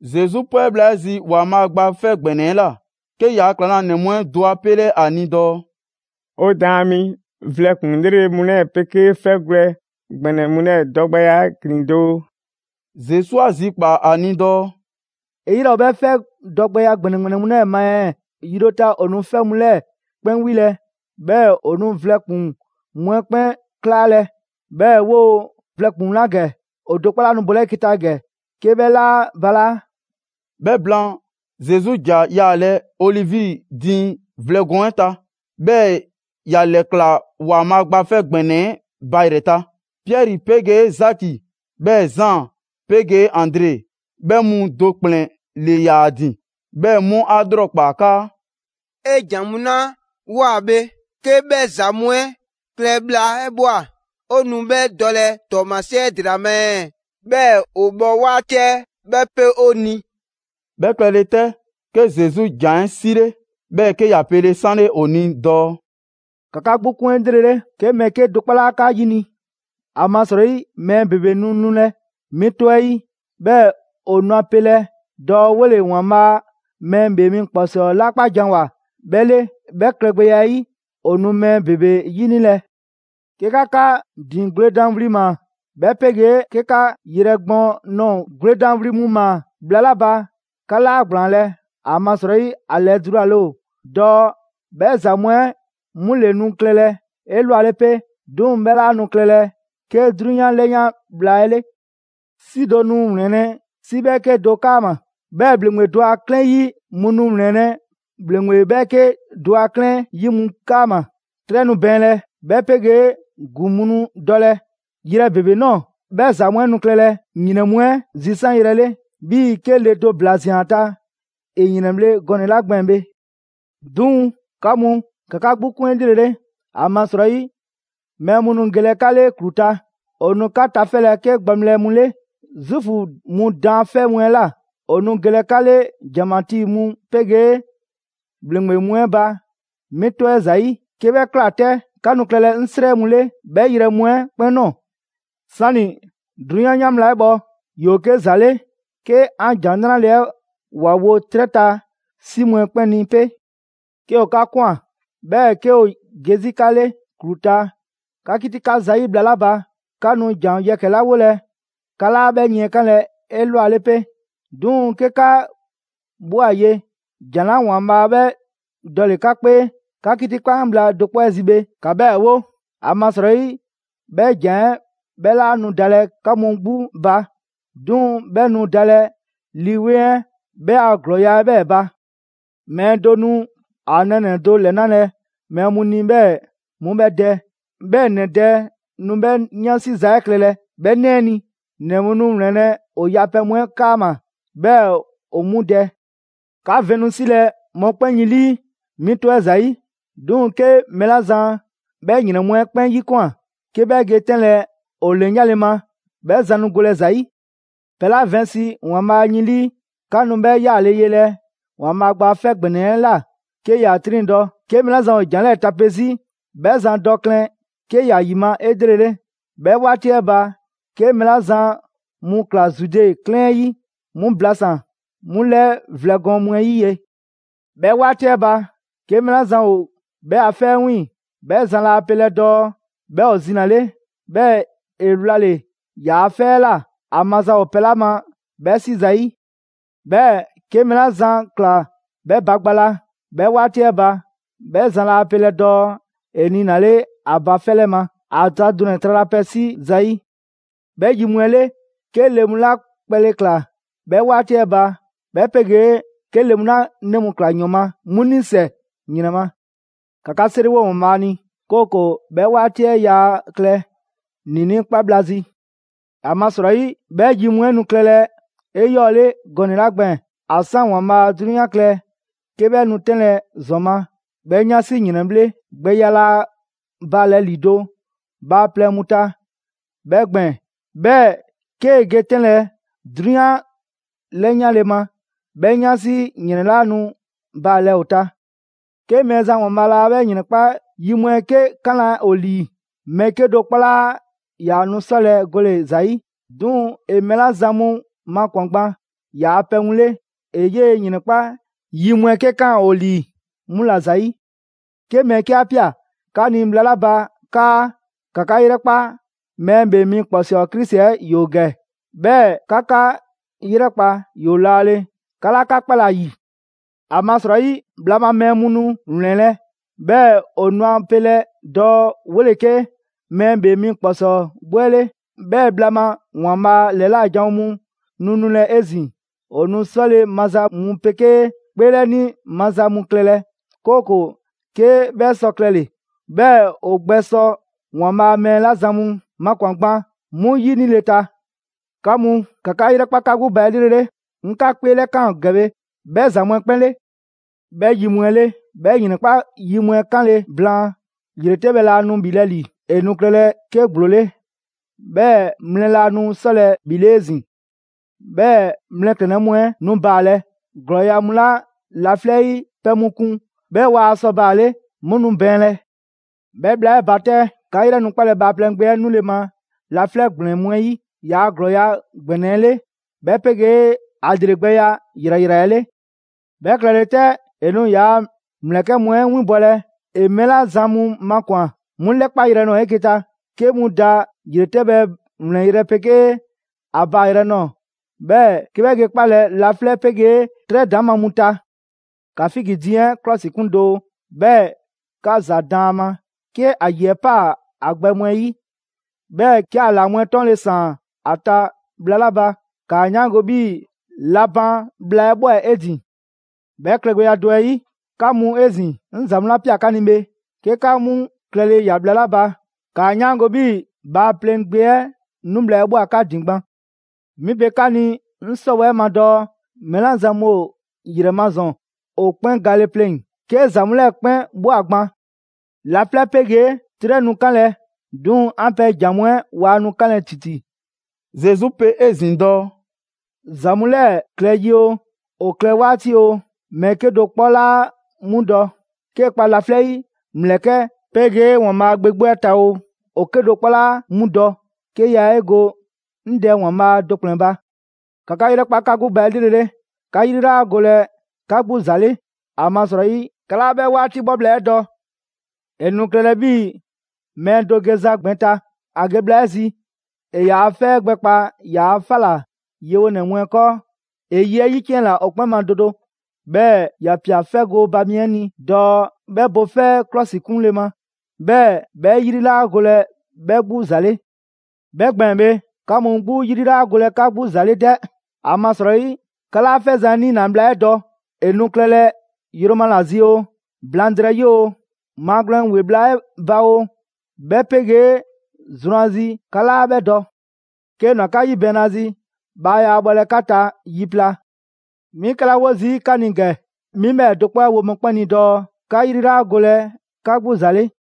Zesu 'pwɛ bhla 'ɛ zi ‑Waanbhaa' Gba 'Fɛ ‑Gbɛnɛ 'ɛ ꞊la, 'ke ‑yaa' ‑klaŋlanɛ mu 'ɛ do 'a 'pele ‑a ni dɔɔ: «'O Daan mi, vlɛ ‑kpuŋ 'lrele‑ mu 'lɛɛ‑ 'pegee 'fɛgwlɛ‑ ‑gbɛnɛ mu 'lɛɛ‑ dɔgbɛya 'ɛ ‑glin doo!» Zesu 'a zikpaa‑ ‑a ni dɔɔ: «'E 'yrɛ ‑o 'bhɛ 'fɛ dɔgbɛya ‑gbɛnɛ ‑gbɛnɛ mu 'lɛɛ‑ ma ɛɛ? Yi do ta, ‑o nu 'fɛ mu 'lɛɛ‑ 'kpɛn 'wilɛ‑, 'bhɛɛ‑ ‑o nu vlɛ ‑kpuŋ mu 'ɛ 'kpɛn 'klaalɛ‑, 'bhɛɛ‑ 'woo‑ vlɛ ‑kpuŋ mu 'la ‑gɛ, ‑o do 'kpɔ 'laa nu bolɛ 'eke‑ ta ‑gɛ 'ke 'bhɛ 'laa balaa'.» 'Bhɛ blaan, Zesu ‑ja yaalɛ Olivi diiŋ vlɛ gɔɔn 'ɛ ta, 'bhɛɛ‑ ‑ya ‑lɛklaa ‑Waanbhaa' Gba 'fɛ ‑Gbɛnɛ 'ɛ ba ‑yrɛ ta. Piɛri 'pegee Zaki, 'bhɛɛ‑ Zaan 'pegee Andre, 'bhɛ mu do ‑kplɛn ‑le 'yaa‑ ‑din, 'bhɛɛ‑ 'mu 'a ‑lrɔkpaa 'kaa: «'E ‑jan mu 'la ꞊woa bhe, 'ke 'bhɛ ‑za mu 'ɛ klɛ bhla 'ɛ ꞊bhwa 'o nu 'bhɛ dɔlɛ ‑tɔɔmasie 'ɛ ‑dela ma ɛɛ? 'Bhɛɛ‑ ‑o bhɔ 'waati 'ɛ 'bhɛ 'pe 'o ni.» 'Bhɛ klɛle 'tɛ, 'ke Zesu ‑jan 'ɛ 'sile, 'bhɛɛ‑ 'ke ‑ya 'pele‑ 'sanle ‑o ni dɔɔ: «‑Ka 'ka 'gbu 'kun 'elrele, 'ke mɛɛ 'kedo‑ 'kpɔ 'laa 'ka 'yini‑. ‑Amasrɔyi, mɛɛ ‑bebe nu nulɛ, 'mi 'tɔ 'ɛ 'yi, 'bhɛɛ‑ ‑o nu ‑a pelɛ dɔɔ 'wole‑ ‑Waanbhaa' Mɛɛ ‑Bhee Mi ‑Kpɔsɔɔ 'la 'kpa ‑janwoa, 'bhɛ 'le! 'Bhɛ klɛgbɛya 'ɛ 'yi, ‑o nu mɛɛ ‑bebe 'yinilɛ. 'Ke 'ka 'ka ‑din gwledan wli ‑maa, 'bhɛ 'pegee 'ke 'ka yrɛ gbɔɔn ꞊nɔɔ gwledan wli mu ‑maa bhla 'la ba, 'ka 'laa ‑gblaanlɛ'. ‑Amasrɔyi ‑a ‑lɛdulale ‑o dɔɔ 'bhɛ ‑za mu 'ɛ 'mu ‑le nu klɛlɛ 'elwale 'pe. 'Duŋ‑ 'bhɛ 'laa nu klɛlɛ 'ke 'drunyan 'lɛyan bhla 'ɛ 'le. 'Si do nu ‑wlɛnlɛ' 'si 'bhɛɛke do 'kaama‑, 'bhɛɛ‑ ‑bhleŋgbe do a 'klɛɛn 'yi mu nu ‑wlɛnlɛ' ‑bhleŋgbe 'bhɛɛke do a 'klɛɛn 'yi mu 'kaama‑. 'Trɛ nu bɛɛnlɛ, 'bhɛ 'pegee ‑gu mu nu dɔlɛ yrɛ ‑bebe ꞊nɔɔ. 'Bhɛ ‑za mu 'ɛ nu klɛlɛ ‑yrɛn mu 'ɛ zisanyrɛ 'le, 'bhii‑ 'ke le do ‑bla ꞊zian ‑a ta ‑e ‑yrɛnbhle' gɔnɛ‑ 'la gbɛɛn‑ bhe. 'Duŋ‑, 'ka mu, ‑ka 'ka 'gbu 'kun 'elrele! ‑Amasrɔyi, mɛɛ mu nu gelɛ 'ka 'le ‑klu ta; ‑o nu 'ka tafɛlɛ 'ke gbaŋbhlɛ mu 'le Zuufu mu daanfɛ' mu 'ɛ ꞊la. ‑O nu gelɛ 'ka 'le ‑janmatii mu 'pegee ‑bhleŋgbe mu 'ɛ ba 'mi 'tɔ 'ɛ ‑zayi'. 'Ke 'bhɛ ꞊kla 'tɛ, 'ka nu klɛlɛ 'ŋ 'srɛ mu 'le 'bhɛ ‑yrɛ mu 'ɛ 'kpɛn ꞊nɔɔ. 'Sani‑ 'drunyan 'yan bhla 'ɛ 'bhɔ, ‑yoo 'ke ‑za 'le 'ke 'an ‑Jan 'Nrale‑ 'ɛ ‑wa wo 'trɛ ta 'si mu 'ɛ 'kpɛn ni 'pe.» «'Ke ‑o 'ka ꞊kwan, 'bhɛɛ‑ 'ke ‑o ge 'zi 'ka 'le ‑klu ta 'ka 'kitikan zayi' bhla 'la ba, 'ka nu ‑jan yɛkɛ‑ 'la 'wolɛ‑, 'ka 'laa 'bhɛ yiɛnkanlɛ 'elwale 'pe. 'Duŋ‑ 'ke 'ka ꞊bhwa ye, ‑jan 'la ‑Waanbhaa' 'bhɛ dɔle‑ 'ka 'kpee 'ka 'kitikan bhla do 'kpɔ 'ɛ zi bhe, ‑ka 'bhɛɛ‑ 'wo. ‑Amasrɔyi 'bhɛ ‑jan 'ɛ 'bhɛ 'laa nu dalɛ 'ka mu 'gbu ba, 'duŋ‑ 'bhɛ nu dalɛ Lii 'Weŋ 'ɛ 'bhɛ a ‑glɔɔya' 'ɛ 'bhɛɛ‑ ba.» «Mɛɛ do nu ‑a nɛɛnɛ‑ do ‑lɛnalɛ mɛɛ mu ni 'bhɛɛ‑ 'mu 'bhɛ dɛ, 'bhɛɛ‑ ‑nɛ dɛ nu 'bhɛɛ‑ 'yansi za 'ɛ klɛlɛ 'bhɛ 'nɛ 'ɛ ni. ‑Nɛ mu nu ‑wlɛnlɛ' ‑o yapɛ mu 'ɛ 'kaama‑ 'bhɛɛ‑ ‑o 'mu dɛ. 'Ka vɛn nu 'silɛ‑ mɔkpɛn' yin 'lii 'mi 'tɔ 'ɛ ‑zayi'. 'Duŋ‑ 'ke mɛɛ 'la zan 'bhɛ ‑yrɛn 'mu 'ɛ 'kpɛn 'yikwan꞊ 'ke 'bhɛ ge 'tɛnlɛ‑ ‑o ‑lɛyanle ma, 'bhɛ zan nu golɛ ‑za 'yi.» «Pɛ 'la vɛnsi ‑Waanbhaa' yin 'lii, 'ka nu 'bhɛ 'yaale‑ yelɛ ‑Waanbhaa' Gba 'Fɛ ‑Gbɛnɛ 'ɛ ꞊la 'ke ‑ya 'triŋdɔ‑. 'Ke mɛɛ 'la zan ‑o ‑jan 'lɛɛ tape 'zi, 'bhɛ zan dɔ klɛn 'ke ‑ya ‑yima' 'elrele. 'Bhɛ 'waati 'ɛ ba, 'ke mɛɛ 'la zan mu ꞊kla Zude 'klɛɛn 'ɛ 'yi, 'mu blasan‑ 'mu ‑lɛɛ vlɛ gɔɔn mu 'ɛ 'yi ye. 'Bhɛ 'waati 'ɛ ba, 'ke mɛɛ 'la zan ‑o 'bhɛ a 'fɛ 'ɛ 'wiiŋ‑, 'bhɛ zan laa pelɛ dɔɔ 'bhɛ ‑o zinale, 'bhɛɛ‑ ‑e wlale‑ ‑yaa' 'fɛ 'ɛ ꞊la, ‑a maza ‑o pɛ 'la ma 'bhɛ 'si zayi'. 'Bhɛɛ‑ 'ke mɛɛ 'la zan꞊kla 'bhɛ ba gba la 'bhɛ 'waati 'ɛ ba, 'bhɛ zan laa pelɛ dɔɔ ‑e niinale ‑a ba 'fɛ 'lɛ ma, ‑a ta dunɛ‑ tralapɛ 'si 'si zayi'. 'Bhɛ yi mu 'ɛ 'le, 'ke le mu 'la kpɛle ꞊kla 'bhɛ 'waati 'ɛ ba, 'bhɛ 'pegee 'ke le mu 'la 'nɛ mu ꞊kla ‑yɔn ma, 'mu 'nisɛ‑ ‑yrɛn ma! ‑Ka 'ka 'seriwo ‑Waanbhaa' ni, 'kooko‑ 'bhɛ 'waati 'ɛ yaa klɛ ‑niinii' 'kpa bhla zi. ‑Amasrɔyi, 'bhɛ yi mu 'ɛ nu klɛlɛ 'eyɔɔle gɔnɛ‑ 'la gbɛɛn‑, ‑a 'san ‑Waanbhaa' 'drunyan klɛ 'ke 'bhɛ nu 'tɛnlɛ‑ ‑zɔn ma, 'bhɛ 'yansi ‑yrɛnbhle' gbɛya 'laa baalɛ ‑lido' bhaaplɛŋ mu ta 'bhɛ gbɛɛn‑. 'Bhɛɛ‑ 'kee‑ ge 'tɛnlɛ‑ 'drunyan 'lɛyanle ma, 'bhɛ 'yansi ‑yrɛn 'laa nu baalɛ ‑o ta. 'Ke Mɛɛzan ‑Waanbhaa' laa 'bhɛ ‑yrɛn 'kpa yi mu 'ɛ 'ke 'kanlɛ‑ ‑o lii, mɛɛ 'kedo‑ 'kpɔ 'laa ‑yaa nu 'sɔlɛ‑ gole‑ ‑za 'yi. 'Duŋ‑ ‑e mɛɛ 'la zan mu makwan‑ gban ‑yaa pɛ mu 'le, ‑e 'yee‑ ‑yrɛn 'kpa yi mu 'ɛ 'ke 'kaan ‑o ‑lii, 'mu ‑la ‑zayi'. 'Ke mɛɛ 'ke 'a ꞊pia 'ka ni bhla 'la ba 'kaa: ‹‑Ka 'ka 'yrɛkpa, Mɛɛ ‑Bhee Mi ‑Kpɔsɔɔ Krisi 'ɛ ‑yoo ‑gɛ›. 'Bhɛɛ‑ ‹‑Ka 'ka 'yrɛkpa, ‑yoo laale!› 'Ka 'laa 'ka 'kpalɛ‑ ‑a ‑yi. ‑Amasrɔyi bhla ma mɛɛ mu nu ‑wlɛnlɛ', 'bhɛɛ‑ ‑o nu a pelɛ dɔɔ 'wole‑ 'ke mɛɛ ‑bhee mu ‑kpɔsɔɔ 'gbu 'ɛ 'le, 'bhɛɛ‑ bhla ma ‑Waanbhaa' ‑lɛla' janwo mu nu nulɛ 'ezin‑. ‑O nu 'sɔle‑ maza mu 'pegee 'kpeelɛni maza mu klɛlɛ, 'kooko‑ 'ke 'bhɛ sɔ klɛle‑, 'bhɛɛ‑ ‑o gbɛsɔ ‑Waanbhaa' mɛɛ 'la zan mu makwan‑ gban 'mu ‑yinile ta. 'Ka mu, ‑ka 'ka 'yrɛkpa 'ka 'gbu ba 'elrele! 'Ŋ 'ka 'kpeelɛlakaan ‑gɛ bhe 'bhɛ ‑za mu 'ɛ 'kpɛn 'le.» «'Bhɛ yi mu 'ɛ 'le, 'bhɛ ‑yrɛn 'kpa yi mu 'ɛ 'kanle‑ blaan, ‑yretɛbhɛ laa nu ‑bhilɛ' ‑li, ‑e nu klɛlɛ 'ke ‑gblo 'le, 'bhɛɛ‑ mlɛ laa nu 'sɔlɛ‑ ‑bhile' 'ezin‑. 'Bhɛɛ‑ mlɛklɛnnɛ mu 'ɛ nu baalɛ. ‑Glɔɔya' mu 'la laflɛ' 'yi pɛ mu kun 'bhɛɛ‑ waa sɔ baale', 'mu nu bɛɛnlɛ. 'Bhɛ bhla 'ɛ ba 'tɛ, 'ka 'yrɛ nu 'kpalɛ‑ Bhaaplɛŋ Gbe 'ɛ 'nule‑ ma laflɛ' ‑gblɛn mu 'ɛ 'yi, ‑yaa' ‑glɔɔya' ‑gbɛnɛ 'ɛ 'le, 'bhɛ pegee ‑a ‑lregbɛya ‑yrayra 'ɛ 'le. 'Bhɛ klɛle 'tɛ, ‑e nu ‑yaa' ‑mlɛkɛ mu 'ɛ winbɔlɛ ‑e mɛɛ 'la zan mu makwan‑, 'mu ‑lɛkpayrɛ ꞊nɔɔ 'eke‑ ta, 'ke 'mu da ‑yretɛbhɛ ‑wlɛnyrɛ' 'pegee ‑a baayrɛ ꞊nɔɔ, 'bhɛɛ‑ 'ke 'bhɛ ge 'kpalɛ‑ laflɛ' 'pegee 'trɛ ‑daŋma' mu ta.» «‑Ka figi diiŋ 'ɛ 'klɔsikun doo, 'bhɛɛ‑ ‑ka ‑za daan ‑a ma: 'ke ‑a ‑yi 'ɛ 'paa‑ ‑a gbɛ mu 'ɛ 'yi, 'bhɛɛ‑ 'ke ‑a ‑laa mu 'ɛ 'tɔɔnle‑ ‑saan ‑a ta bhla 'la ba, 'kaa 'yaango‑ 'bhii‑ la ban bhla 'ɛ ꞊bhwa 'e ‑din. 'Bhɛ klɛgbɛya do 'ɛ 'yi, 'ka mu 'ezin‑, 'ŋ ‑za mu 'la ꞊pia 'ka ni bhe, 'ke 'ka 'mu klɛle ‑ya bhla 'la ba, ‑kaa 'yaango‑ 'bhii‑ Bhaaplɛŋ Gbe 'ɛ 'nu bhla 'ɛ ꞊bhwa 'ka ‑din gban. 'Mi pe 'ka ni 'ŋ 'sɔwɛɛ‑ 'ɛ ma dɔɔ: mɛɛ 'la zan mu ‑o ‑yrɛ ma ‑zɔn, ‑o 'kpɛn gale pleŋ‑, 'ke ‑za mu 'lɛɛ‑ 'kpɛn ꞊bhwa gban. Laflɛ' 'pegee 'trɛ nu 'kanlɛ‑ 'duŋ‑ 'an pɛ ‑jan mu 'ɛ waa nu 'kanlɛ‑ ‑titi.» Zesu pe 'ezin‑ dɔɔ: «‑Za mu 'lɛɛ‑ klɛ yi oo, ‑o klɛ 'waati oo, mɛɛ 'kedo‑ 'kpɔ 'laa 'mu dɔ. 'Kee‑ kpa laflɛ' 'yi ‑mlɛkɛ' 'pegee ‑Waanbhaa' Gbe 'gbu 'ɛ ta oo, ‑o 'kedo‑ 'kpɔ 'laa 'mu dɔ, 'ke yaa 'e go 'ŋ Dɛ ‑Waanbhaa' do ‑kplɛn ba. ‑Ka 'ka 'yrɛkpa 'ka 'gbu ba 'elrele, 'ka 'yri 'laa golɛ 'ka 'gbu ‑za 'le, ‑amasrɔyi 'ka 'laa 'bhɛ 'waati 'bhɔ bhla 'ɛ dɔ. ‑E nu klɛlɛ 'bhii‑ mɛɛ do geza gbɛn ta: ‑a ge bhla 'ɛ zi, ‑e ‑yaa' 'fɛ 'ɛ gbɛkpaa ‑yaa' 'fa ‑la yewonɛ mu 'ɛ 'kɔɔ. ‑E ye 'ɛ 'yiciɛnna ‑o 'kpɛn ma do do, 'bhɛɛ‑ ‑ya ꞊pia 'fɛ gooba mi 'ɛ ni dɔɔ 'bhɛ bo 'fɛ 'ɛ ‑klɔsikunle ma, 'bhɛɛ‑ 'bhɛ 'yri 'laa golɛ 'bhɛ 'gbu ‑za 'le. 'Bhɛ gbɛɛn‑ bhe, 'ka mu 'gbu 'yri 'laa golɛ 'ka 'gbu ‑za 'le 'dɛ, ‑amasrɔyi 'ka 'laa 'fɛzan‑ 'ɛ 'niina‑ bhla 'ɛ dɔ, ‑e nu klɛlɛ yroma ‑la zi oo, blaŋdrɛyi oo, maagwlɛn ‑we bhla 'ɛ ba oo, 'bhɛ 'pegee zrwanzi, 'ka 'laa 'bhɛ dɔ. 'Kee‑ ꞊nwa 'ka 'yibɛɛnnazi, bhaa yaa bhɔlɛ 'ka ta yi pla. 'Mi 'kɛla 'wo zii' 'ka ni ‑gɛ, 'mi 'bhɛɛ‑ do 'kpɔ 'ɛ wo mɔkpɛn' ni dɔɔ: ‹'Ka 'yri 'laa golɛ 'ka 'gbu ‑za 'le.›»